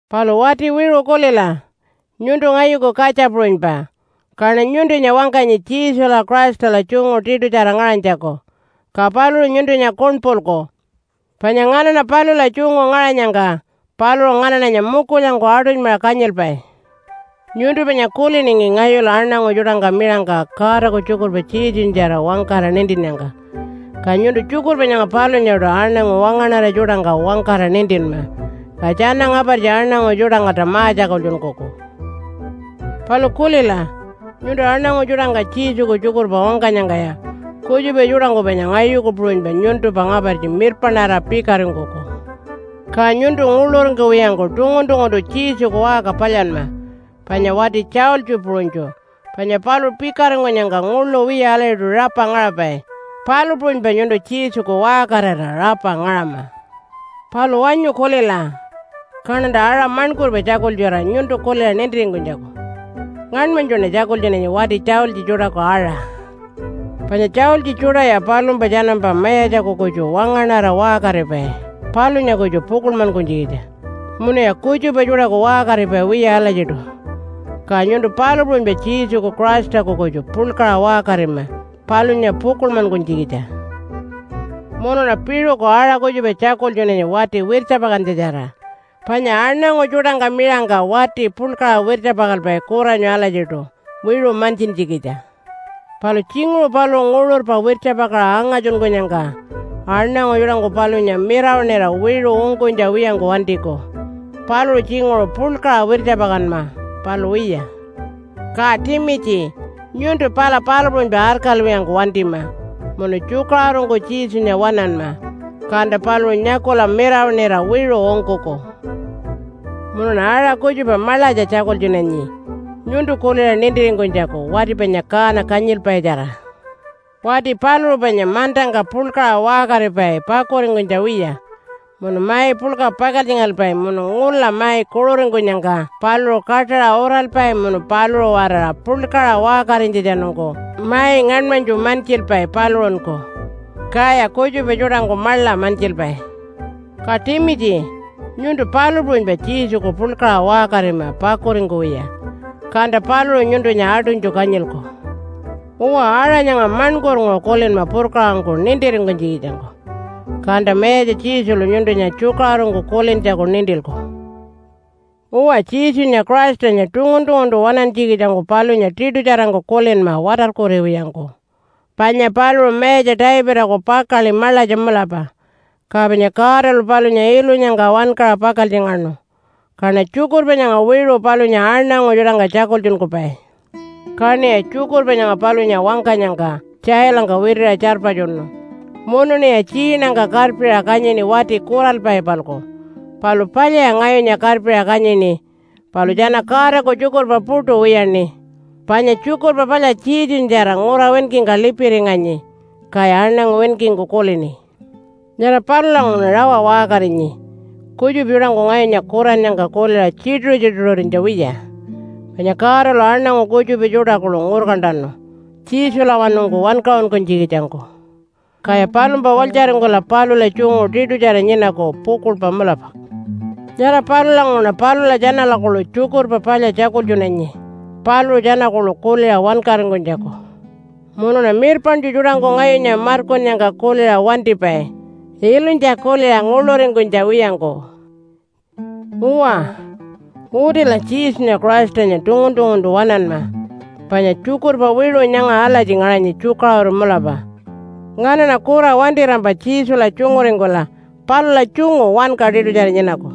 Palu wati wiṟu kulila, nyuntu ngayuku katja puṟunypa, kaṉa nyuntunya wangkanyi Jesula Christala tjungu tiṯutjara ngaṟanytjaku, ka paluṟu nyuntunya kuṉpulku. Panya nganaṉa palula tjungu ngaṟanyangka paluṟu nganaṉanya mukulyangku aṯunymaṟa kanyilpai. Nyuntu panya kuliningi ngayulu aṉangu tjuṯangka miṟangka Godaku tjukurpa Jesunyatjara wangkara nintinnyangka. Ka nyuntu tjukurpa nyanga palunyaṯu aṉangu wangaṉara tjuṯangka wangkara nintinma. Ka tjana ngapartji aṉangu tjuṯangkalta ma-tjakultjunkuku. Palu kulila, nyuntu aṉangu tjuṯangka Jesuku tjukurpa wangkanyangkaya kutjupa tjuṯangku panya ngayuku puṟunypa nyuntumpa ngapartji mirpaṉarira pikaringkuku. Ka nyuntu nguḻuringkuwiyangku tungun-tunguntu Jesuku waṟka palyanma, panya wati tjaultji puṟunytju, panya paluṟu pikaringkunyangka nguḻu wiya alatjiṯu rapa ngaṟapai, palu puṟunypa nyuntu Jesuku waṟkarira rapa ngaṟama. Palu wanyu kulila, kaṉanta aṟa maṉkurpa tjakultjura nyuntu kuliṟa nintiringkunytjaku. Ngaṉmanytjuṉa tjakultjunanyi wati tjaultji tjuṯaku aṟa. Panya tjaultji tjuṯaya palumpa tjanampa mayatjaku kutju wangaṉara waṟkaripai palunya kutju pukuḻmankunytjikitja munuya kutjupa tjuṯaku waṟkaripai wiya alatjiṯu. Ka nyuntu palu puṟunypa Jesuku Christaku kutju puḻkaṟa waṟkarima palunya pukuḻmankunytjikitja. Munuṉa piṟuku aṟa kutjupa tjakultjunanyi wati wirtjapakantjatjara. Panya aṉangu tjuṯangka miṟangka wati puḻkaṟa wirtjapakalpai kuranyu alatjiṯu wiṟu mantjintjikitja. Palu tjinguṟu paluṟu nguṟurpa wirtjapakaṟa angatjunkunyangka aṉangu tjuṯangku palunya miṟawaṉira wiṟu ungkunytja wiyangku wantiku. Paluṟu tjinguṟu puḻkaṟa wirtjapakanma, palu wiya. Ka Timitji nyuntu pala palu puṟunypa arkalwiyangku wantima munu tjukaṟurungku Jesunya waṉanma, kanta paluṟu nyakula miṟawaṉira wiṟu ungkuku. Munuṉa aṟa kutjupa maḻatja tjakultjunanyi nyuntu kuliṟa nintiringkunytjaku wati panya kaana kanyilpaitjara. Wati paluṟu panya mantangka puḻkaṟa waṟkaripai pakuringkunytja wiya munu mai puḻka pakaltjingalpai munu ngula mai kuṟuringkunyangka paluṟu kaṯaṟa uralpai munu paluṟu-waraṟa puḻkaṟa waṟkarinytjatjanungku mai ngaṉmanytju mantjilpai paluṟunku, kaya kutjupa tjuṯangku maḻa mantjilpai. Ka Timitji, nyuntu palu puṟunypa Jesuku puḻkaṟa waṟkarima pakuringkuwiya, kanta paluṟu nyuntunya aṯunytju kanyilku. Uwa, aṟa nyanga maṉkurnguṟu kulinma purkaṟangku nintiringkunytjikitjangku, kanta Mayatja Jesulu nyuntunya tjukaṟurungku kulintjaku nintilku. Uwa, Jesunya Christanya tungun-tunguntu waṉantjikitjangku palunya tiṯutjarangku kulinma watarkuriwiyangku, panya paluṟu Mayatja Davidaku pakaḻi maḻatja mulapa, ka panya Godalu palunya ilunyangka wankaṟa pakaltjingaṉu. Kaṉa tjukurpa nyanga wiṟu palunya aṉangu tjuṯangka tjakultjunkupai. Kaṉiya tjukurpa nyanga palunya wangkanyangka tjailangka witiṟa tjarpatjunu munuṉiya tjiinangka karpiṟa kanyini wati kuralpai-palku. Palu palyaya ngayunya karpiṟa kanyini, palu tjana Godaku tjukurpa puṯu wiyaṉi. Panya Tjukurpa Palya Jesunyatjara ngura winkingka lipiringanyi, kaya aṉangu winkingku kulini. Nyara palulanguṟuṉa rawa waṟkarinyi kutjupa tjuṯangku ngayunya kurannyangka kuliṟa tjituṟu-tjituṟurinytja wiya. Panya Godalu aṉangu kutjupa tjuṯa kuḻu ngurkantanu Jesulawanungku wankaṟunkunytjikitjangku, kaya palumpa walytjaringkula palula tjungu tiṯutjara nyinaku pukuḻpa mulapa. Nyara palulanguṟuṉa palula tjanala kuḻu Tjukurpa Palya tjakultjunanyi paluṟu tjana kuḻu kuliṟa wankaringkunytjaku, munuṉa mirpaṉtju tjuṯangku ngayunya markunnyangka kuliṟa wantipai ilunytja kuliṟa nguḻuringkunytja wiyangku. Uwa, utila Jesunya Christanya tungun-tunguntu waṉanma, panya tjukurpa wiṟu nyanga alatji ngaṟanyi tjukaṟuru mulapa, “Nganaṉa kura wantirampa Jesula tjunguringkula palula tjungu wanka tiṯutjara nyinaku.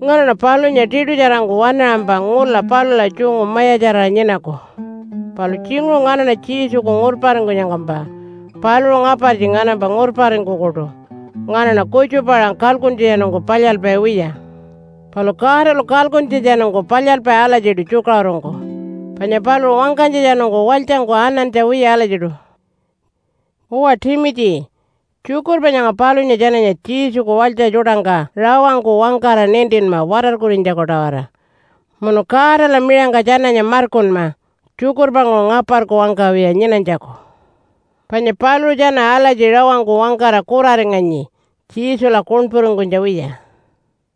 Nganaṉa palunya tiṯutjarangku waṉaṟampa ngula palula tjungu mayatjarira nyinaku. Palu tjinguṟu nganaṉa Jesuku ngurparingkunyangkampa, paluṟu ngapartji nganampa ngurparingkukuṯu. Nganaṉa kutjupa-aṟa kalkuntjatjanungku palyalpai wiya. Palu Godalu kalkuntjatjanungku palyalpai alatjiṯu, tjukaṟurungku. Panya paluṟu wangkanytjatjanungku walytjangku anantja wiya alatjiṯu.” Uwa Timitji, tjukurpa nyanga palunya tjananya Jesuku walytja tjuṯangka rawangku wangkara nintinma watarkurinytjaku-tawara. Munu Godala miṟangka tjananya markunma tjukurpanguṟu ngaparku wangkawiya nyinanytjaku. Panya paluṟu tjana alatji rawangku wangkara kuraringanyi Jesula kuṉpuringkunytja wiya.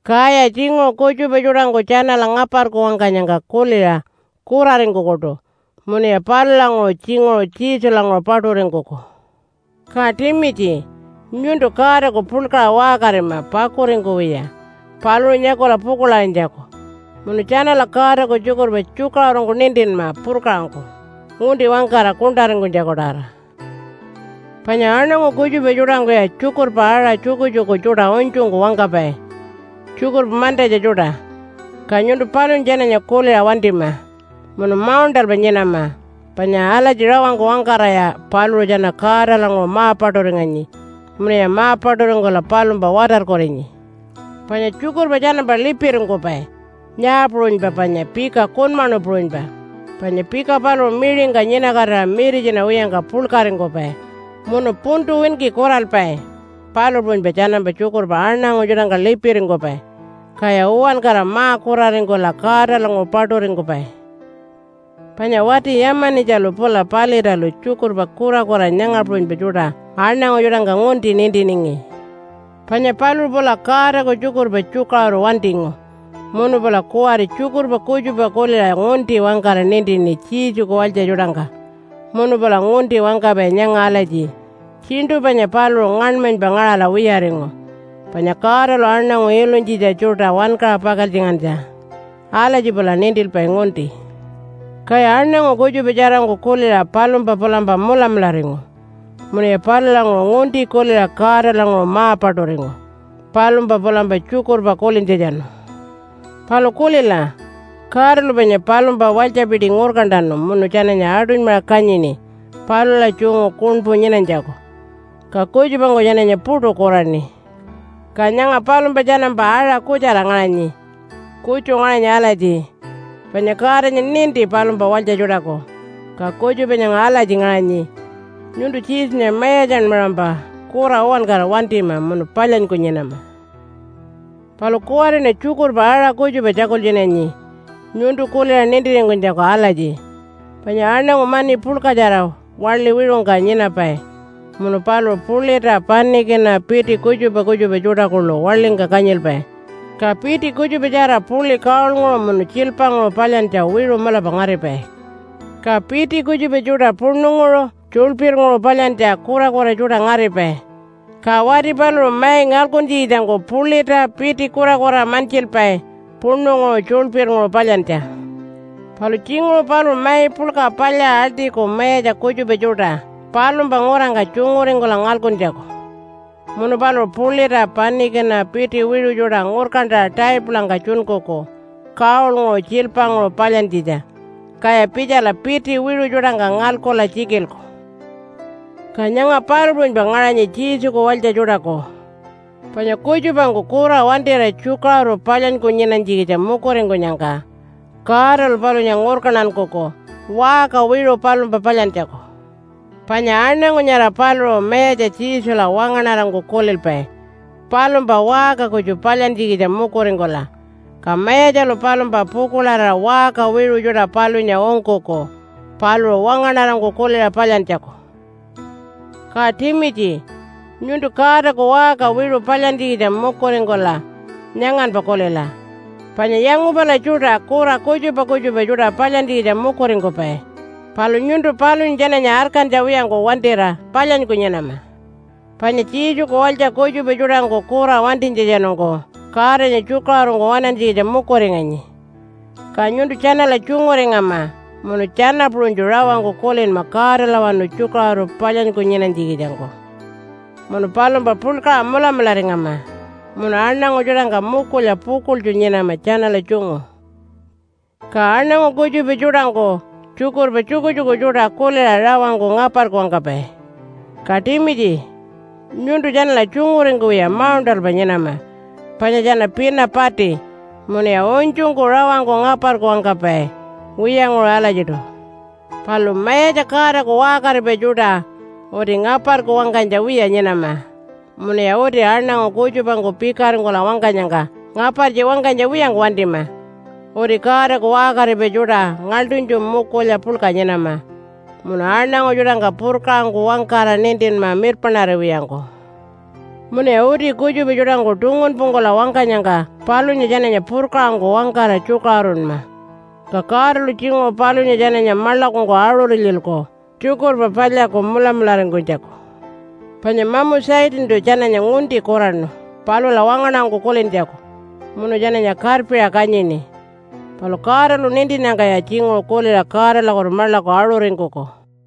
Kaya tjinguṟu kutjupa tjuṯangku tjanala ngaparku wangkanyangka kuliṟa kuraringkukuṯu munuya palulanguṟu tjinguṟu Jesulanguṟu paṯuringkuku. Ka Timitji, nyuntu Godaku puḻkaṟa waṟkarima pakuringkuwiya paluṟu nyakula pukuḻarinytjaku. Munu tjanala Godaku tjukurpa tjukaṟurungku nintinma purkaṟangku, ngunti wangkara kuṉṯaringkunytjaku-tawara. Panya aṉangu kutjupa tjuṯangkuya tjukurpa aṟa tjukutjuku tjuṯa unytjungku wangkapai, tjukurpa mantatja tjuṯa. Ka nyuntu palunya tjananya kuliṟa wantima munu mauṉṯalpa nyinama, panya alatji rawangku wangkaraya paluṟu tjana Godalanguṟu ma-paṯuringanyi munuya ma-paṯuringkula palumpa watarkurinyi. Panya tjukurpa tjanampa lipiringkupai, nyaa puṟunypa panya pika kunmaṉu puṟunypa, panya pika paluṟu miṟingka nyinakatira miritjina wiyangka puḻkaringkupai munu puntu winki kuralpai, palu puṟunypa tjanampa tjukurpa aṉangu tjuṯangka lipiringkupai, kaya uwankara ma-kuraringkula Godalanguṟu paṯuringkupai. Panya wati Yama-nitjalu pula Palitalu tjukurpa kurakura nyanga puṟunypa tjuṯa aṉangu tjuṯangka ngunti nintiningi. Panya paluṟu pula Godaku tjukurpa tjukaṟuru wantingu munu pula kuwari tjukurpa kutjupa kuliṟa ngunti wangkara nintini Jesuku walytja tjuṯangka. Munu pula ngunti wangkapai nyanga alatji, “Tjiṉṯu panya paluṟu ngaṉmanypa ngaṟala wiyaringu panya Godalu aṉangu ilunytjitja tjuṯa wankaṟa pakaltjingantja.” Alatji pula nintilpai ngunti. Kaya aṉangu kutjupa tjarangku kuliṟa palumpa pulampa mulamularingu munuya palulanguṟu ngunti kuliṟa Godalanguṟu ma-paṯuringu, palumpa pulampa tjukurpa kulintjatjanu. Palu kulila, Godalu panya palumpa walytjapiti ngurkantanu munu tjananya aṯunymaṟa kanyini palula tjungu kuṉpu nyinanytjaku, ka kutjupangku tjananya puṯu kuraṉi. Ka nyanga palumpa tjanampa aṟa kutjara ngaṟanyi. Kutju ngaṟanyi alatji, “Panya Godanya ninti palumpa walytja tjuṯaku.” Ka kutjupa nyanga alatji ngaṟanyi, “Nyuntu Jesunya mayatjanmaṟampa kura uwankara wantima munu palyanyku nyinama.” Palu kuwariṉa tjukurpa aṟa kutjupa tjakultjunanyi nyuntu kuliṟa nintiringkunytjaku alatji, panya aṉangu mani puḻkatjara waḻi wiṟungka nyinapai munu paluṟu pulita, panikina, piti kutjupa kutjupa tjuṯa kuḻu waḻingka kanyilpai. Ka piti kutjupatjara puḻi gold-nguṟu munu tjiilpanguṟu palyantja wiṟu mulapa ngaripai. Ka piti kutjupa tjuṯa puṉunguṟu tjuḻpirnguṟu palyantja kurakura tjuṯa ngaripai. Ka wati paluṟu mai ngalkuntjikitjangku pulita piti kurakura mantjilpai puṉunguṟu tjuḻpirnguṟu palyantja. Palu tjinguṟu paluṟu mai puḻka palyaṟa aḻṯiku mayatja kutjupa tjuṯa palumpa ngurangka tjunguringkula ngalkuntjaku. Munu paluṟu pulita panikina piti wiṟu tjuṯa ngurkantaṟa taipulangka tjunkuku gold-nguṟu tjiilpanguṟu palyantjitja, kaya pitjala piṯi wiṟu tjuṯangka ngalkula tjikilku. Ka nyanga palu puṟunypa ngaṟanyi Jesuku walytja tjuṯaku. Panya kutjupangku kura wantira tjukaṟuru palyanyku nyinanytjikitja mukuringkunyangka Godalu palunya ngurkantankuku waṟka wiṟu palumpa palyantjaku. Panya aṉangu nyara paluṟu Mayatja Jesula wangaṉarangku kulilpai palumpa waṟka kutju palyantjikitja mukuringkula. Ka Mayatjalu palumpa pukuḻarira waṟka wiṟu tjuṯa palunya ungkuku paluṟu wangaṉarangku kuliṟa palyantjaku. Ka Timitji, nyuntu Godaku waṟka wiṟu palyantjikitja mukuringkula nyanganpa kulila. Panya yangupala tjuṯa kura kutjupa kutjupa tjuṯa palyantjikitja mukuringkupai, palu nyuntu palunya tjananya arkantja wiyangku wantira palyanyku nyinama. Panya Jesuku walytja kutjupa tjuṯangku kura wantinytjatjanungku Godanya tjukaṟurungku waṉantjikitja mukuringanyi, ka nyuntu tjanala tjunguringama munu tjana puṟunytju rawangku kulinma Godalawanu tjukaṟuru palyanyku nyinanytjikitjangku munu palumpa puḻkaṟa mulamularingama, munu aṉangu tjuṯangka mukulya pukuḻtju nyinama tjanala tjungu. Ka aṉangu kutjupa tjuṯangku tjukurpa tjukutjuku tjuṯa kuliṟa rawangku ngaparku wangkapai. Ka Timitji, nyuntu tjanala tjunguringkuwiya mauṉṯalpa nyinama, panya tjana pina pati munuya unytjungku rawangku ngaparku wangkapai wiyanguṟu alatjiṯu. Palu Mayatja Godaku waṟkaripai tjuṯa uti ngaparku wangkanytja wiya nyinama munuya uti aṉangu kutjupangku pikaringkula wangkanyangka ngapartji wangkanytja wiyangku wantima. Uti Godaku waṟkaripai tjuṯa ngaḻṯunytju mukulya puḻka nyinama, munu aṉangu tjuṯangka purkaṟangku wangkara nintinma mirpaṉariwiyangku. Munuya uti kutjupa tjuṯangku tungunpungkula wangkanyangka palunya tjananya purkaṟangku wangkara tjukaṟurunma. Ka Godalu tjinguṟu palunya tjananya maḻakungku aṟurilyilku Tjukurpa Palyaku mulamularingkunytjaku. Panya mamu Satantu tjananya ngunti kuraṉu palula wangaṉarangku kulintjaku munu tjananya karpiṟa kanyini. Palu Godalu nintinnyangkaya tjinguṟu kuliṟa Godalakutu maḻaku aṟuringkuku.